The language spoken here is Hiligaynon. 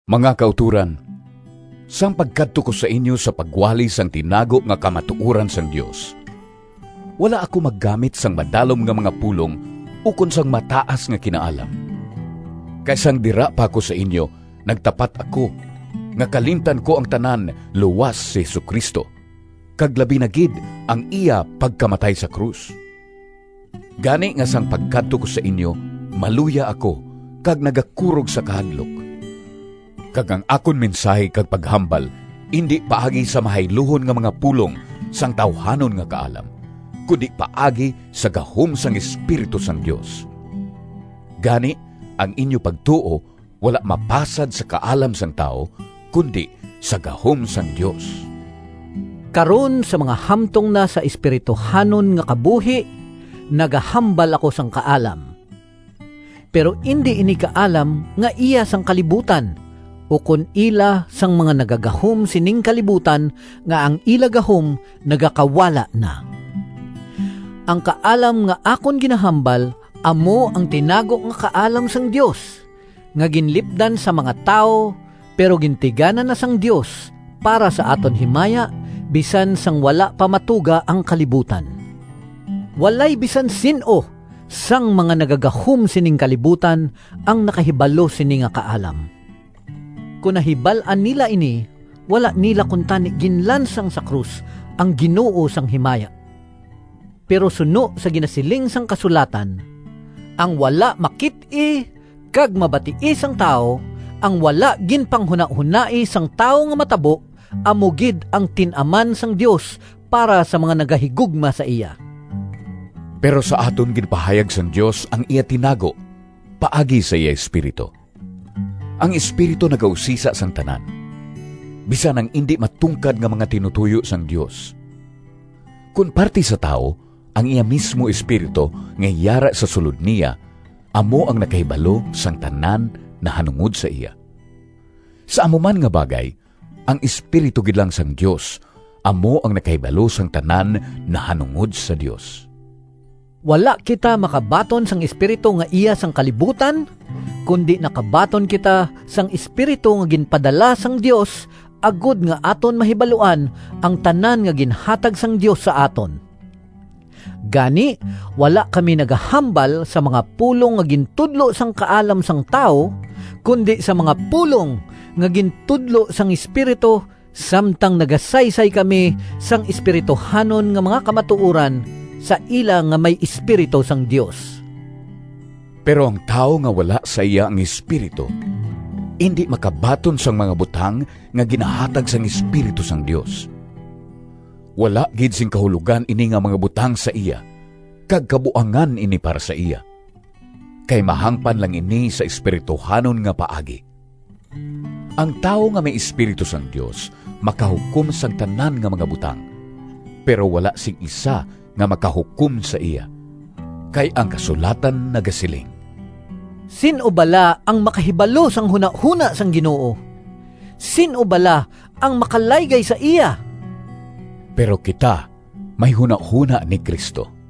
Mga kautoran, sang pagkadto ko sa inyo sa pagwali sang tinago nga kamatuoran sang Dios, wala ako maggamit sang madalom nga mga pulong ukon sang mataas nga kinaalam. Kay sang dira pa ako sa inyo nagtapat ako nga kalimtan ko ang tanan, luas si Jesu-Cristo, kag labi na gid ang iya pagkamatay sa krus. Gani nga sang pagkadto ko sa inyo maluya ako kag nagakurog sa kahadlok, kag ang akon mensahi kag paghambal indi paagi sa mahayluhon nga mga pulong sang tawuhanon nga kaalam, kundi paagi sa gahom sang Espiritu sang Dios. Gani, ang inyo pagtuo wala mapasad sa kaalam sang tawo, kundi sa gahom sang Dios. Karon sa mga hamtong na sa espirituhanon nga kabuhi nagahambal ako sang kaalam. Pero indi ini kaalam nga iya sang kalibutan, ukon ila sang mga nagagahom sining kalibutan nga ang ila gahom nagakawala na. Ang kaalam nga akon ginahambal amo ang tinago nga kaalam sang Dios, nga ginlipdan sa mga tawo, pero gintigana na sang Dios para sa aton himaya, bisan sang wala pa matuga ang kalibutan. Walay bisan sin-o sang mga nagagahom sining kalibutan ang nakahibalo sini nga kaalam. Kon nahibal-an nila ini, wala nila kuntani ginlansang sa krus ang Ginoo sang himaya. Pero suno sa ginasiling sang kasulatan, “Ang wala makit-i Kag mabatii sang tawo, Ang wala ginpanghunahonai Sang tawo nga matabo, Amo gid ang tin-aman sang Dios Para sa mga nagahigugma sa iya.” Pero sa aton ginpahayag sang Dios ang iya tinago paagi sa iya Espiritu. Ang Espiritu nagausisa sang tanan, bisan ang indi matungkad nga mga tinutoyo sang Dios. Kon parti sa tawo, ang iya mismo espiritu nga yara sa sulod niya amo ang nakahibalo sang tanan nahanungod sa iya. Sa amo man nga bagay, ang Espiritu gid lang sang Dios amo ang nakahibalo sang tanan nahanungod sa Dios. Wala kita makabaton sang espiritu nga iya sang kalibutan, kundi nakabaton kita sang Espiritu nga ginpadala sang Dios, agod nga aton mahibaluan ang tanan nga ginhatag sang Dios sa aton. Gani, wala kami nagahambal sa mga pulong nga gintudlo sang kaalam sang tawo, kundi sa mga pulong nga gintudlo sang Espiritu samtang nagasaysay kami sang espirituhanon nga mga kamatuoran sa ila nga may Espiritu sang Dios. Pero ang tawo nga wala sa iya ang Espiritu indi makabaton sang mga butang nga ginahatag sang Espiritu sang Dios. Wala gid sing kahulogan ini nga mga butang sa iya kag kabuangan ini para sa iya, kay mahangpan lang ini sa espirituhanon nga paagi. Ang tawo nga may Espiritu sang Dios makahukom sang tanan nga mga butang, pero wala sing isa nga makahukom sa iya. Kay ang kasulatan nagasiling, “Sin-o bala ang makahibalo Sang hunahona sang Ginoo? Sin-o bala ang makalaygay sa iya?” Pero kita may hunahona ni Cristo.